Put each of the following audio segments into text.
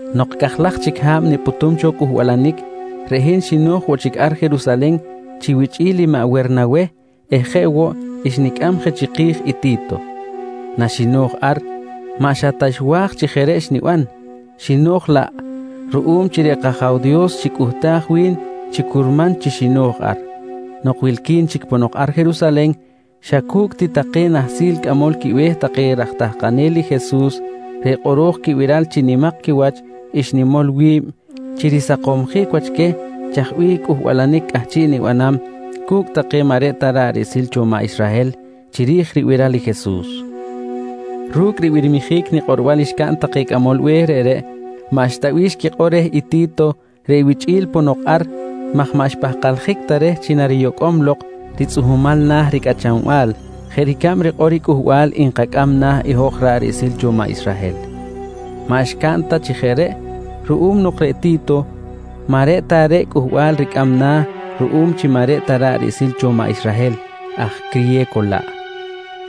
Nok cajlaj chic ha̱b nipꞌutum cho cꞌuhbalanic, reꞌ hin xino̱j woꞌ chic ar Jerusalen chi wichꞌi̱l i maꞌ Wernaweh eh jeꞌ woꞌ xnicꞌam je chiki̱j i Ti̱to. Naxino̱j ar maꞌ xa ta nwa̱j chi jeꞌ reꞌ xniban, xino̱j laꞌ ruꞌum chi reꞌ kAja̱w Dios xicꞌuhtaj wi̱n chi curman chi xino̱j ar. Nok wilqui̱n chic ponok ar Jerusalen, xa cu̱cꞌ ti take nahsil cꞌamol quibe̱h take raj tahkanel i Jesus reꞌ kꞌoro̱j quibiral chi nimak quiwach xnimol wi̱b chi risakomsjic wach queh chaj bih cꞌuhbalanic cꞌahchiꞌ nibanam cu̱cꞌ take maꞌ reꞌ ta ra̱ꞌ riꞌsil cho maꞌ Israhel chiri̱j ribiral i Jesus. Ru̱cꞌ ribirmijic nikꞌorbal xcaꞌn take cꞌamol be̱h reꞌreꞌ, maꞌxta bih xquikꞌor reh i Ti̱to reꞌ wichꞌi̱l ponok ar maj maꞌ xpahkaljic ta reh chi nariyocꞌom lok ritzꞌuhmal na̱ ricꞌachanbal jeꞌ ricab rikꞌor i cꞌuhbal nkacꞌam na̱ i hoj ra̱ꞌ riꞌsil cho maꞌ Israhel. Maꞌ xcaꞌn ta chi jeꞌ reꞌ ruꞌum nok reꞌ Ti̱to maꞌ reꞌ ta reꞌ cꞌuhbal ricꞌam na̱ ruꞌum chi maꞌ reꞌ ta ra̱ꞌ riꞌsil cho maꞌ Israhel, aj criye̱co laꞌ.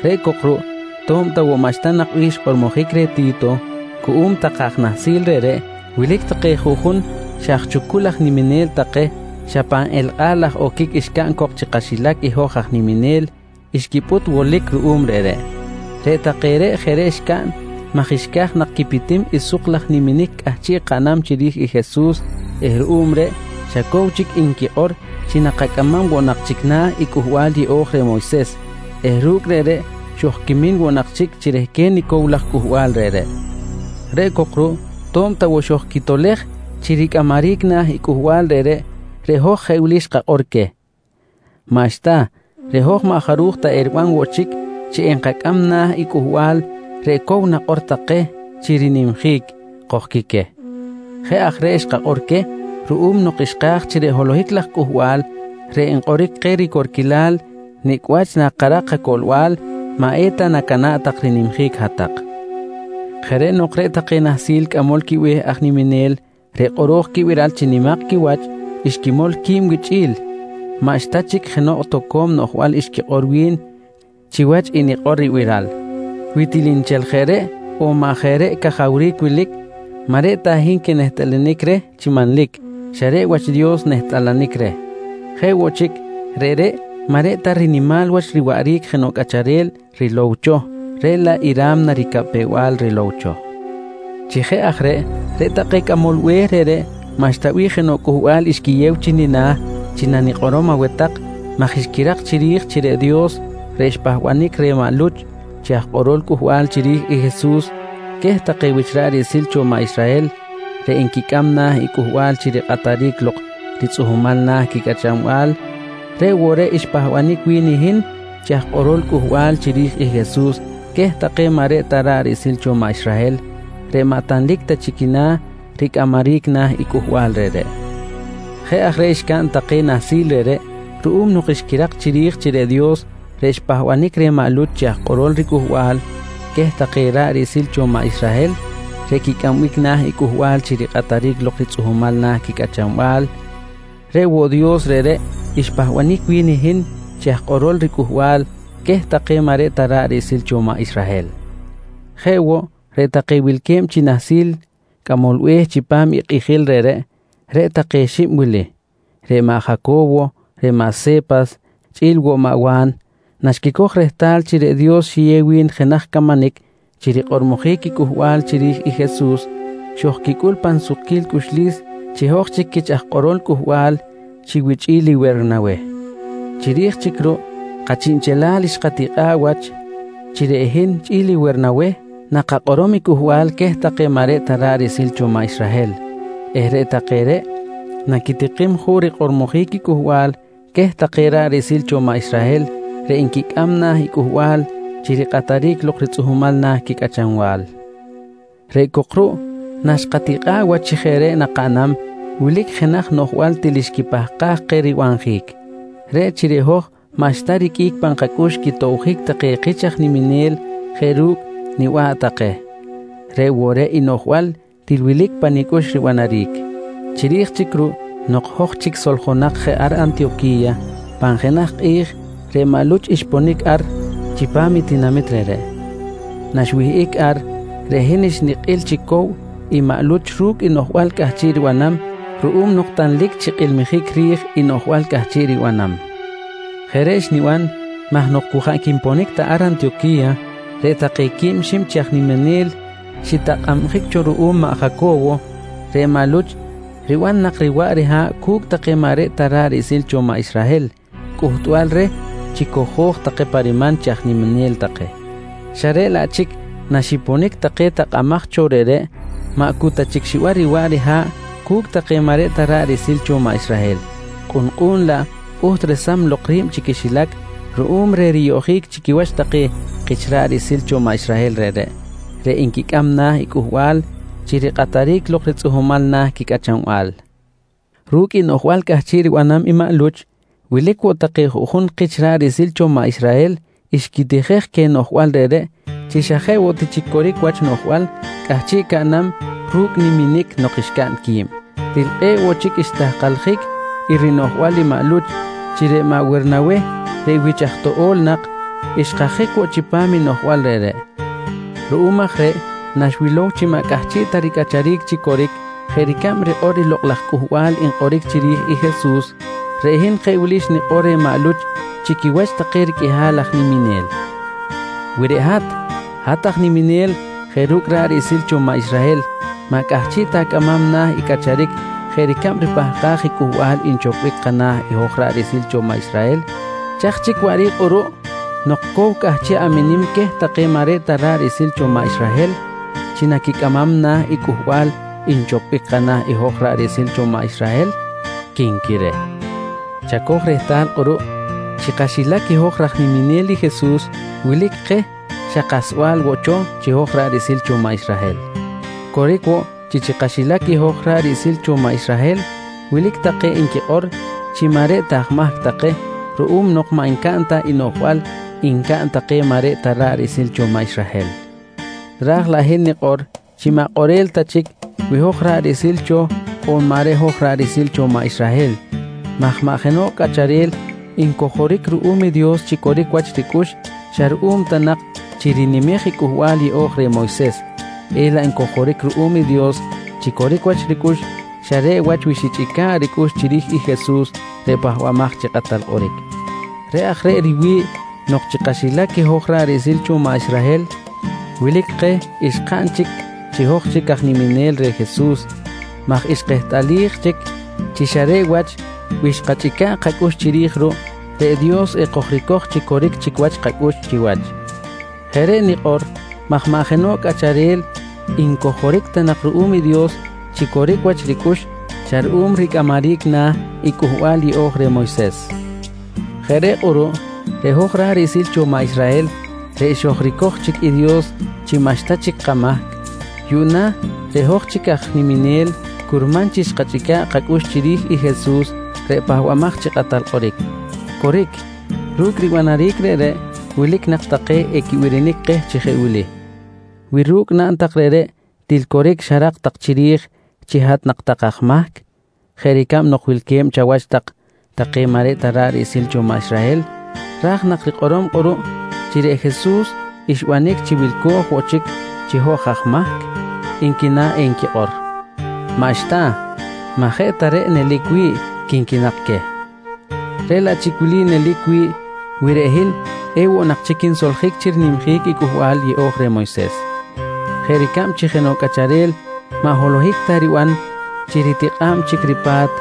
Reꞌ cok ruꞌ to̱b ta woꞌ maꞌxta nak bih xkꞌormojic reh Ti̱to cuꞌum take aj nahsil reꞌreꞌ, wilic take juꞌjun xa aj chucul aj niminel take, xa pan elkꞌa̱l laj oquic xcaꞌn cok chi kaxilac i hoj aj niminel, xquipꞌut wolic ruꞌum reꞌreꞌ. Reꞌ take reꞌ jeꞌ reꞌ xcaꞌn maj xca̱j nak quipitim i suk laj niminic cꞌahchiꞌ kaꞌnam chiri̱j i Jesus eh ruꞌum reꞌ xa cow chic nquikꞌor chi nakacꞌamam woꞌ nak chic na̱ i Cꞌuhbal Yeꞌo̱j reh Moyses eh ru̱cꞌ reꞌreꞌ xojquimin woꞌ nak chic chi rehquen i cow laj cꞌuhbal reꞌreꞌ. Reꞌ cok ruꞌ to̱b ta woꞌ xojquitolej chi ricꞌamaric na̱ i cꞌuhbal reꞌreꞌ, reꞌ hoj jeꞌ wili xkakꞌor queh: «Maꞌxta, reꞌ hoj maꞌ jaruj ta eriban woꞌ chic chi enkacꞌam na̱ i cꞌuhbal reꞌ cow nakꞌor tak keh chi rinimjic, kojqui queh. Jeꞌ aj reꞌ xkakꞌor queh ruꞌum nok xka̱j chi reꞌ holohic laj cꞌuhbal reꞌ nkꞌoric keh ricorquilal nicꞌ wach nakarak kacoꞌlbal, maꞌ eta nacana̱ꞌ tak rinimjic hat-tak. Jeꞌ reꞌ nok reꞌ take nahsil cꞌamol quibe̱h aj niminel reꞌ kꞌoro̱j quibiral chi nimak quiwach xquimol qui̱b wichꞌi̱l maꞌxta chic jenoꞌ toco̱m noꞌjbal xquikꞌor wi̱n chi wach i nikꞌor ribiral. Wi til nchel jeꞌ reꞌ on maꞌ jeꞌ reꞌ cajawric wilic, maꞌ reꞌ ta hin quinehtꞌalanic reh chi manlic xa reꞌ wach Dios nehtꞌalanic reh. Jeꞌ woꞌ chic, reꞌreꞌ maꞌ reꞌ ta rinimal wach riwaꞌric jenoꞌ cꞌacharel rilow cho, reꞌ laꞌ i ra̱mna ricapew-bal rilow cho. Chi jeꞌ aj reꞌ, reꞌ take cꞌamol be̱h reꞌreꞌ maꞌxta bih jenoꞌ cꞌuhbal xquiyew chi nina̱ chi nanikꞌorom aweh tak maj xquirak chiri̱j chi reꞌ Dios reꞌ xpahbanic reh maꞌ Luch chi aj kꞌorol cꞌuhbal chiri̱j Jesus queh take wich ra̱ꞌ riꞌsil cho maꞌ Israhel reꞌ nquicꞌam na̱ i cꞌuhbal chi rikꞌataric lok ritzꞌuhmal na̱ quicꞌachanbal, reꞌ woꞌ reꞌ xpahbanic wi̱n i hin chi aj kꞌorol cꞌuhbal chiri̱j i Jesus queh take maꞌ reꞌ ta ra̱ꞌ riꞌsil cho maꞌ Israhel reꞌ maꞌ tanlic ta chi quina̱ ricꞌamaric na̱ i cꞌuhbal reꞌreꞌ. Jeꞌ aj reꞌ xcaꞌn take nahsil reꞌreꞌ ruꞌum nok xquirak chiri̱j chi reꞌ Dios reꞌ xpahbanic reh maꞌ Luch chi aj kꞌorol riCꞌuhbal queh take ra̱ꞌ riꞌsil cho maꞌ Israhel reꞌ quicꞌambic na̱ i cꞌuhbal chi rikꞌataric lok ritzꞌuhmal na̱ quicꞌachanbal, reꞌ woꞌ Dios reꞌreꞌ xpahbanic wi̱n i hin chi aj kꞌorol riCꞌuhbal queh take maꞌ reꞌ ta ra̱ꞌ riꞌsil cho maꞌ Israhel. Jeꞌ woꞌ, reꞌ take wilque̱b chi nahsil cꞌamol be̱h chipam i kꞌijil reꞌreꞌ, reꞌ take xib wili: Reꞌ maꞌ Jaco̱wo, reꞌ maꞌ Se̱pas chꞌi̱l woꞌ maꞌ Wa̱n, naxquicoj rehtal chi reꞌ Dios xiyew wi̱n jenaj camanic chi rikꞌormojic i cꞌuhbal chiri̱j i Jesus, xojquicꞌul pan sukquil cꞌuxlis chi hoj chic quich aj kꞌorol cꞌuhbal chi wichꞌi̱l i Wernaweh. Chiri̱j chic ruꞌ kachiꞌnchelal xkatikꞌa̱ꞌ wach chi reꞌ hin chꞌi̱l i Wernaweh nakakꞌorom i cꞌuhbal queh take maꞌ reꞌ ta ra̱ꞌ riꞌsil cho maꞌ Israhel eh reꞌ take reꞌ naquitikim juꞌ rikꞌormojic i cꞌuhbal queh take ra̱ꞌ riꞌsil cho maꞌ Israhel reꞌ nquicꞌam na̱ i cꞌuhbal chi rikꞌataric lok ritzꞌuhmal na̱ quicꞌachanbal. Reꞌ cok ruꞌ naxkꞌatikꞌa̱ꞌ wach chi jeꞌ reꞌ nakaꞌnam, wilic jenaj noꞌjbal til xquipahkaj keh ribanjic: Reꞌ chi reꞌ hoj maꞌxta riqꞌuic pan kacꞌux quitobjic take kich aj niminel jeꞌ ru̱cꞌ niba̱ꞌ take. Reꞌ woꞌ reꞌ i noꞌjbal til wilic pa nicꞌux ribanaric. Chiri̱j chic ruꞌ nok hoj chic soljonak je ar Antiyoqui̱ya, pan jenaj kꞌi̱j reꞌ maꞌ Luch xponic ar chi pa̱m tinamit reꞌreꞌ. Naxwihꞌic ar, reꞌ hin xnikꞌil chi cow i maꞌ Luch ru̱cꞌ i noꞌjbal cꞌahchiꞌ ribanam ruꞌum nok tanlic chi kꞌilmijic ri̱j i noꞌjbal cꞌahchiꞌ ribanam. Jeꞌ reꞌ xniban maj nok cu jaꞌ quiponic ta ar Antiyoqui̱ya take quib xib chi aj niminel xitakꞌabjic cho ruꞌum maꞌ Jaco̱wo, reꞌ maꞌ Luch riban nak riwaꞌ riha̱ꞌ cu̱cꞌ take maꞌ reꞌ ta ra̱ꞌ riꞌsil take cho maꞌ Israhel cꞌuhtbal reh chi cojo̱j take pa riman chi aj niminel take xa reꞌ laꞌ chic naxiponic take takꞌamaj take cho reꞌreꞌ, maꞌ cu ta chic xiban riwaꞌ riha̱ꞌ cu̱cꞌ take maꞌ reꞌ ta ra̱ꞌ riꞌsil take cho maꞌ Israhel, kꞌu̱nkꞌu̱n laꞌ pꞌuht resam lok ri̱b chi quixilac ruꞌum reh riyoꞌjic chi quiwach take kich ra̱ꞌ riꞌsil cho maꞌ Israhel reꞌreꞌ, reꞌ nquicꞌam na̱ cꞌuhbal chi rikꞌataric lok ritzꞌuhmal na̱ quicꞌachanbal. Ru̱cꞌ i noꞌjbal cꞌahchiꞌ ribanam i maꞌ Luch, wilic woꞌ take juꞌjun kich ra̱ꞌ riꞌsil cho maꞌ Israhel xquitijej queh noꞌjbal reꞌreꞌ chi xa jeꞌ woꞌ ti chic coric wach noꞌjbal cꞌahchiꞌ caꞌnam ru̱cꞌ niminic nok xcaꞌn qui̱b. Til kꞌe̱ꞌ woꞌ chic xtahkaljic i rinoꞌjbal i maꞌ Luch chi reꞌ maꞌ Wernaweh reꞌ wich aj toꞌo̱l nak, xkajic woꞌ chipam i noꞌjbal reꞌreꞌ. Ruꞌum aj reꞌ naxwilow chi maꞌ cꞌahchiꞌ ta ricꞌacharic chi coric jeꞌ ricab rikꞌor i lokꞌ laj cꞌuhbal nkꞌoric chiri̱j i Jesus, reꞌ hin jeꞌ wili xnikꞌor reh maꞌ Luch chi quiwach take riqꞌuihal aj niminel: «Wi reꞌ hat, hat aj niminel jeꞌ ru̱cꞌ ra̱ꞌ riꞌsil cho maꞌ Israhel maꞌ cꞌahchiꞌ ta acꞌamam na̱ i cꞌacharic jeꞌ ricab ripahkaj i cꞌuhbal nchopbic kana̱ i hoj ra̱ꞌ riꞌsil cho maꞌ Israhel, chaj chic waꞌric kꞌuruꞌ nok cow cꞌahchiꞌ aminim queh take maꞌ reꞌ ta ra̱ꞌ riꞌsil cho maꞌ Israhel chi naquicꞌamam na̱ i cꞌuhbal nchopbic kana̱ i hoj ra̱ꞌ riꞌsil cho maꞌ Israhel? quinqui reh. Chacoj rehtal kꞌuruꞌ chi kaxilac hoj raj niminel i Jesus wilic keh xa kasba̱l woꞌ cho chi hoj ra̱ꞌ riꞌsil cho maꞌ Israhel. Coric woꞌ chi chi kaxilac hoj ra̱ꞌ riꞌsil cho maꞌ Israhel wilic take nquikꞌor chi maꞌ reꞌ ta aj mahc take ruꞌum nok maꞌ ncaꞌn ta i noꞌjbal ncaꞌn take maꞌ reꞌ ta ra̱ꞌ riꞌsil cho maꞌ Israhel. Raj laꞌ hin nikꞌor chi maꞌ kꞌorel ta chic wi hoj ra̱ꞌ riꞌsil cho on maꞌ reꞌ ta hoj ra̱ꞌ riꞌsil cho maꞌ Israhel maj maꞌ jenoꞌ cꞌacharel ncojoric ruꞌum i Dios chi coric wach ricꞌux xa ruꞌum ta nak chi rinimej i Cꞌuhbal Yeꞌo̱j reh Moyses, elaꞌ ncojoric ruꞌum i Dios chi coric wach ricꞌux xa reꞌ wach wi xichꞌica̱ꞌ ricꞌux chiri̱j i Jesus reꞌ Pahbamaj chi Kꞌatal Kꞌoric. Reꞌ aj reꞌ riwi̱ꞌ nok chi kaxilac hoj ra̱ꞌ riꞌsil cho maꞌ Israhel, wilic keh xkaꞌn chic chi hoj chic aj niminel reh Jesus maj xkehtꞌalij chic chi xa reꞌ wach wi xkachꞌica̱ꞌ kacꞌux chiri̱j ruꞌ, reꞌ Dios ekojricoj chi coric chic wach kacꞌux chiwach. Jeꞌ reꞌ nikꞌor maj maꞌ jenoꞌ cꞌacharel ncojoric ta nak ruꞌum i Dios chi coric wach ricꞌux xa ruꞌum ricꞌamaric na̱ i Cꞌuhbal Yeꞌo̱j reh Moyses. Jeꞌ reꞌ kꞌuruꞌ reꞌ hoj ra̱ꞌ riꞌsil cho maꞌ Israhel reꞌ xojricoj chic i Dios chi maꞌxta chic kamahc, yuꞌna reꞌ hoj chic aj niminel curman chi xkachꞌica̱ꞌ kacꞌux chiri̱j i Jesus reꞌ Pahbamaj chi Kꞌatal Kꞌoric. Coric, ru̱cꞌ ribanaric reꞌreꞌ wilic nak take equibirinic keh chi jeꞌ wili: «Wi ru̱cꞌ naꞌn tak reꞌreꞌ, til coric xarak tak chiri̱j chi hat nak tak aj mahc jeꞌ ricab nok wilque̱b chawach tak take maꞌ reꞌ ta ra̱ꞌ riꞌsil cho maꞌ Israhel raj na rikꞌorom kꞌuruꞌ chi reꞌ Jesus xbanic chi wilco̱j woꞌ chic chi hoj aj mahc? nqui na enquikꞌor. Maꞌxta, maꞌ jeꞌ ta reꞌ nelic wi̱ꞌ, quinqui nak queh. Reꞌ laꞌ chic wili nelic wi̱ꞌ wi reꞌ hin ewoꞌ nak chic quinsoljic chi rinimjic i Cꞌuhbal Yeꞌo̱j reh Moyses: Jeꞌ ricab chi jenoꞌ cꞌacharel maꞌ holohic ta riban chi ritikꞌa̱b chic ripa̱t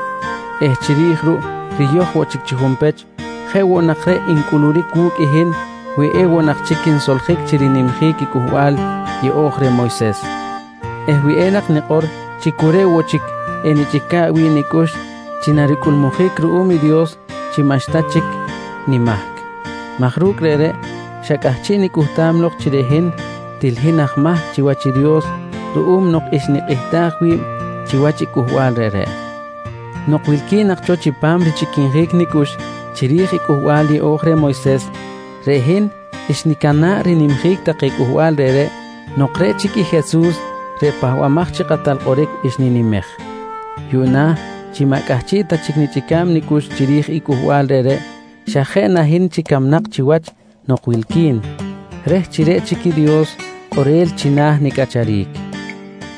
eh chiri̱j ruꞌ riyoj woꞌ chic chi junpech, jeꞌ woꞌ nak reꞌ encꞌuluric wu̱cꞌ i hin wi ewoꞌ nak chic quinsoljic chi rinimjic i Cꞌuhbal Yeꞌo̱j reh Moyses eh wi enak nikꞌor chi cu reꞌ woꞌ chic enichꞌica̱ꞌ wi̱ꞌ nicꞌux chi naricꞌulmujic ruꞌum i Dios chi maꞌxta chic nimahc maj ru̱cꞌ reꞌreꞌ xa cꞌahchiꞌ nicꞌuhtam lok chi reꞌ hin, til hin aj mahc chiwach i Dios ruꞌum nok xnikꞌihtaj wi̱b chiwach i cꞌuhbal reꞌreꞌ. Nok wilqui̱n nak cho chipam richꞌiquinjic nicꞌux chiri̱j i Cꞌuhbal Yeꞌo̱j reh Moyses, reꞌ hin xnicana̱ꞌ rinimjic take cꞌuhbal reꞌreꞌ nok reꞌ chic i Jesus reꞌ Pahbamaj chi Kꞌatal Kꞌoric xninimej. Yuꞌna chi maꞌ cꞌahchiꞌ ta chic nichꞌica̱b nicꞌux chiri̱j i cꞌuhbal reꞌreꞌ xa jeꞌ na hin chic camnak chiwach nok wilqui̱n reh chi reꞌ chic Dios kꞌorel china̱ nicꞌacharic.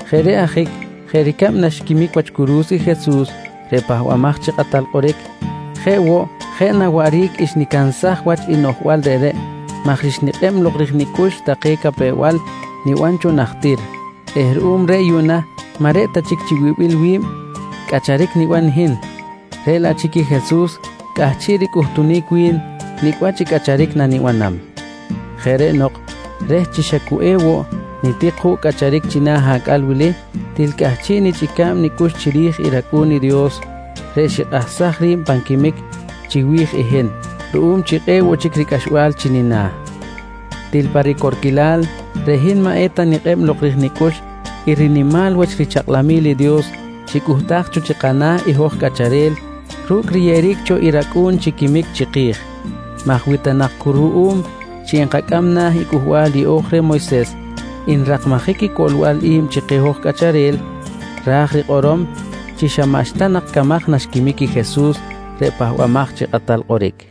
Jeꞌ reꞌ ajic jeꞌ ricab naxquimic wach curu̱s i Jesus reꞌ Pahbamaj chi Kꞌatal Kꞌoric, jeꞌ woꞌ jeꞌ na waꞌric xnicansaj wach i noꞌjbal reꞌreꞌ maj xnikꞌeb lok rij nicꞌux take capew-bal niban cho najtir eh ruꞌum reꞌ yuꞌna maꞌ reꞌ ta chic chi wibil wi̱b cꞌacharic niban hin, reꞌ laꞌ chic i Jesus cꞌahchiꞌ ricꞌuhtunic wi̱n nicꞌ wach i cꞌacharic nanibanam. Jeꞌ reꞌ nok reh chi xa cu ewoꞌ nitik juꞌ cꞌacharic china̱ acꞌal wili til cꞌahchiꞌ nichꞌica̱b nicꞌux chiri̱j rAcꞌu̱n i Dios reꞌ xikꞌahsaj ri̱b pan quimic chiwi̱j i hin ruꞌum chi kꞌe̱ꞌ cho ricꞌaxbal chi nina̱. Til pa ricorquilal reꞌ hin maꞌ eta nikꞌeb lok rij nicꞌux i rinimal wach richakꞌlamil i Dios xicꞌuhtaj cho chi kana̱ i hoj cꞌacharel ru̱cꞌ riyeꞌeric cho i rAcꞌu̱n chi quimic chiki̱j maj wi ta nak cu ruꞌum chi nkacꞌam na̱ i Cꞌuhbal Yeꞌo̱j reh Moyses nrakmajic i coꞌlbal i̱b chi keh hoj cꞌacharel, ra̱j rikꞌorom chi xa maꞌxta nak camaj naxquimic i Jesus reꞌ Pahbamaj chi Kꞌatal Kꞌoric.